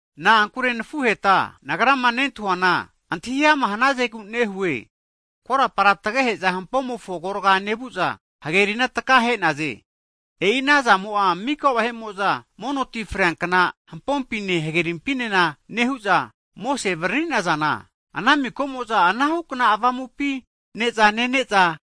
Na'ankure nafuheta, Nagrama nentahuana, antahi ama hnazegu nehue, korapara tagehe'za hampomofo agorga'a nevu'za, hagerina takahe'naze. E'i ana zamo'a mika vahe'mo'za mono ti freankna hampompine hagerimpina nehu'za, Mosese avariri'nazana, ana mika'mo'za ana hukna avamupi ne'za nene'za,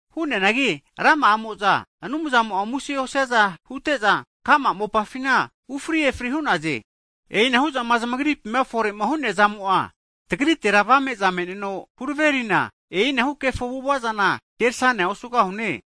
Hu'neanagi rama'amo'za Anumzamo'a muse osiaza hute'za, ka'ma mopafina ufri efri hu'naze. E'inahu zama zamagripima fore'ma hu'neazamo'a, tagritera avame'za me'neno huraverina, e'inahu kefo avu'ava'zana kerasane osugahune.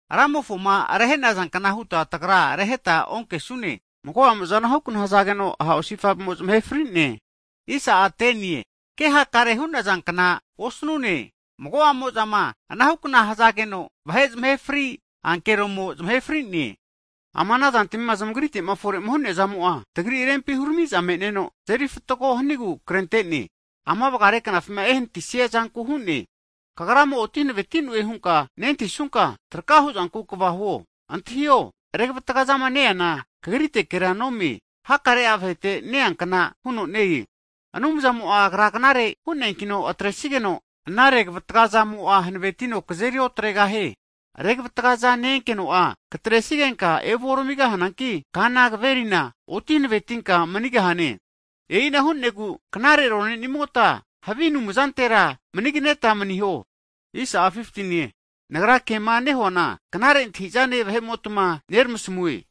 Ramofoma rehe'nazankna huta tagra reheta onkesune, mago'amo'za anahu kna hzageno, ha osifave'mo zmahe fri'ne. Ke hakare hu'nazankna osnune, mago'amo'zama anahu kna hzageno, vahe'ma zmahefri ankeromo zamahe fri'ne. Ama ana zantmima zmagrite fore'ma hu'neazamo'a, tagri rempi huramiza me'neno tazeri fatgo hanigu krente'ne. Ama vgare knafima ehnatisia zanku hu'ne. Kagrama oti hanaveti'noe hunka nentahisunka, traka hu'zanku kva huo! Antahio! revatga zama ne-eana kagritekera nome, hakare'a vahete neankna huno ne-e. Anumzamo'a Agra knare hu'neankino atresigeno, ana revatgazamo'a hanavetino kazeri otregahie. Revatgaza ne-enkeno'a katresigenka evuoramigahananki, kana kaverina oti hanavetinka manigahane. E'ina hu'negu knare rone'nimota havige anumzantetira manigneta maniho. Nagra kema nehuana knare antahi'zane vahe'motma neramasamue.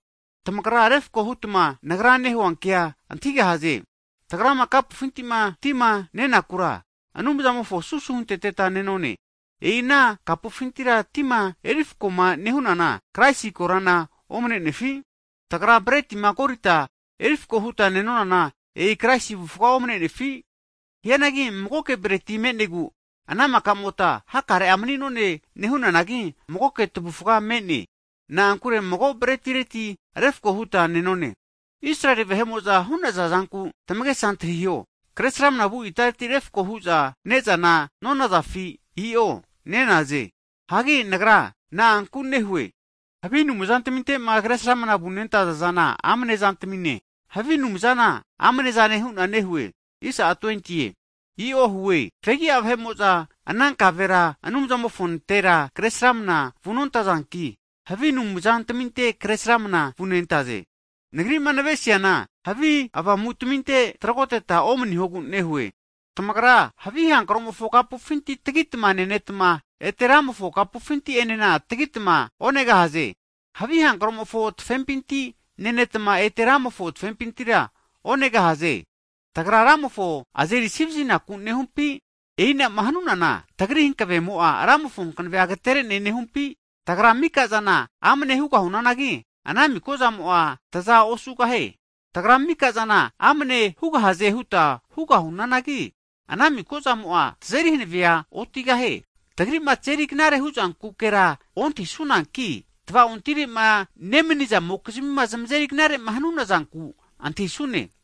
Tamagra refko hutma nagra nehua kea antahigahaze. Tagrama kapufinti tima nenakura, Anumzamofo susu hunteteta nenone. E'i ana kapufinti tima erifko'ma nehunana, Kraisi korana omne'nefi? Tagra bretima korita, erifko huta nenonana, e'i Kraisi avufga omne'nefi? Hianagi magoke breti me'negu, ana maka'mota hakare mani'none nehunanagi, magoke tavufga me'ne. Na'ankure mago bretireti refko huta nenone. Israeli vahe'mo'za hu'naza zanku tamagesa antahiho, kresramna vu itaretira refko hu'za ne'zana nonazafi? I'o nenaze. Hagi nagra na'anku nehue? Havige anumzantaminte kresramna vunentaza zana amnezane, havi anumzana amnezane hu'na nehue. I'o hue! Fegi'a vahe'mo'za anankavera Anumzamofontera kre sramna vunontazanki, havi avamutaminte kresramna vunentaze. Nagri'ma nave'nesiana havi avamutaminte tragoteta omnihogu nehue. Tamagra havi hankromofo kapufinti tagitma nenetma, ete Ramofo kapufinti enena tagitma onegahaze. Havi hankromofo tafepinti nenetma, ete Ramofo tafepintira onegahaze. Tagra Ramofo azeri asivazinaku nehumpi? E'ina'ma hanunana tagri hanavemo'a, Ramofo hankavea agetere'ne nehumpi? I'o. Tagra mika'zana amne hugahunanagi, ana mika'zamo'a taza osugahie. Tagra mika'zana amne hugahaze huta hugahunanagi, ana mika'zamo'a, tazeri hanave otigahie. Tagri'ma tazeri knare huzankukera ontahisunanki, tva'ontire'ma nemnizamokizmi zmazeri knare'ma hanunazanku antahisune.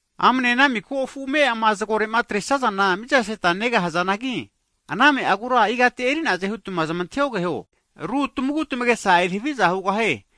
Amne ana miko ame'ama zgore'ma atresazana mizaseta negahazanagi, ana ame'a agura igati eri'naze hutma zmantahiogeho. Ru tmagu tamagesa eri haviza hugahie.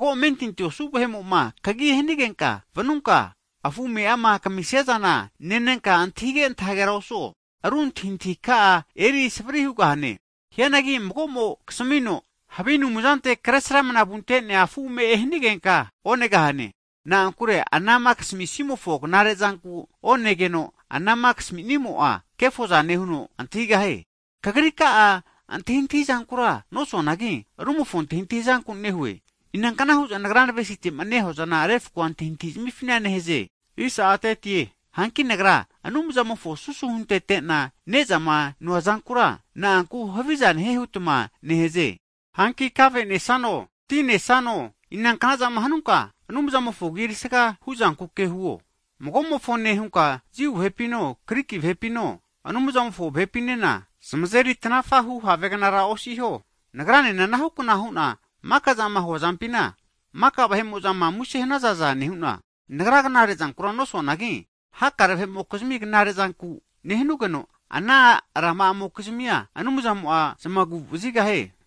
Mago amentinti osu vahe'mo'ma kagi hanigenka vanunka, afu ame'ama kamisiazana nenenka antahige' antahagera osuo, ru antahintahi ka'a eri savri hugahane. Hianagi mago'mo kasamino, havi anumzante kresramna vunte'nea afu ame'e hanigenka onegahane. Na'ankure ana kamisimofo knare'zanku hunka onegeno, anama kamisimo'a kefozane huno antahigahie. Kagrika'a antahintahizankura nosuanagi, rumofo antahintahizanku nehue. Inankna hu'za nagra navesite'ma huazana refko antahintahifina nehaze? Hanki nagra Anumzamofo susu huntete'na ne'zama noazankura, na'anku haviza nehie hutma nehaze? Hanki, kave nesano tinesano inankna'zama hanunka, Anumzamofo agi erisaga hu'zanke huo. Mago'mofone hunka Jiu vahepino, Griki vahepino, Anumzamofo vahepinena, zmazeri tanafa hu havegnara osiho. Nagranena anahukna hu'na maka'zama huazampina, maka vahe'mo'zama muse hanazaza nehu'na, nagra knare'zankura nosuanagi, hakare vahe'mokizmi knare'zanku nehanugeno, rama'amokizmia Anumzamo zamagu'vazigahie.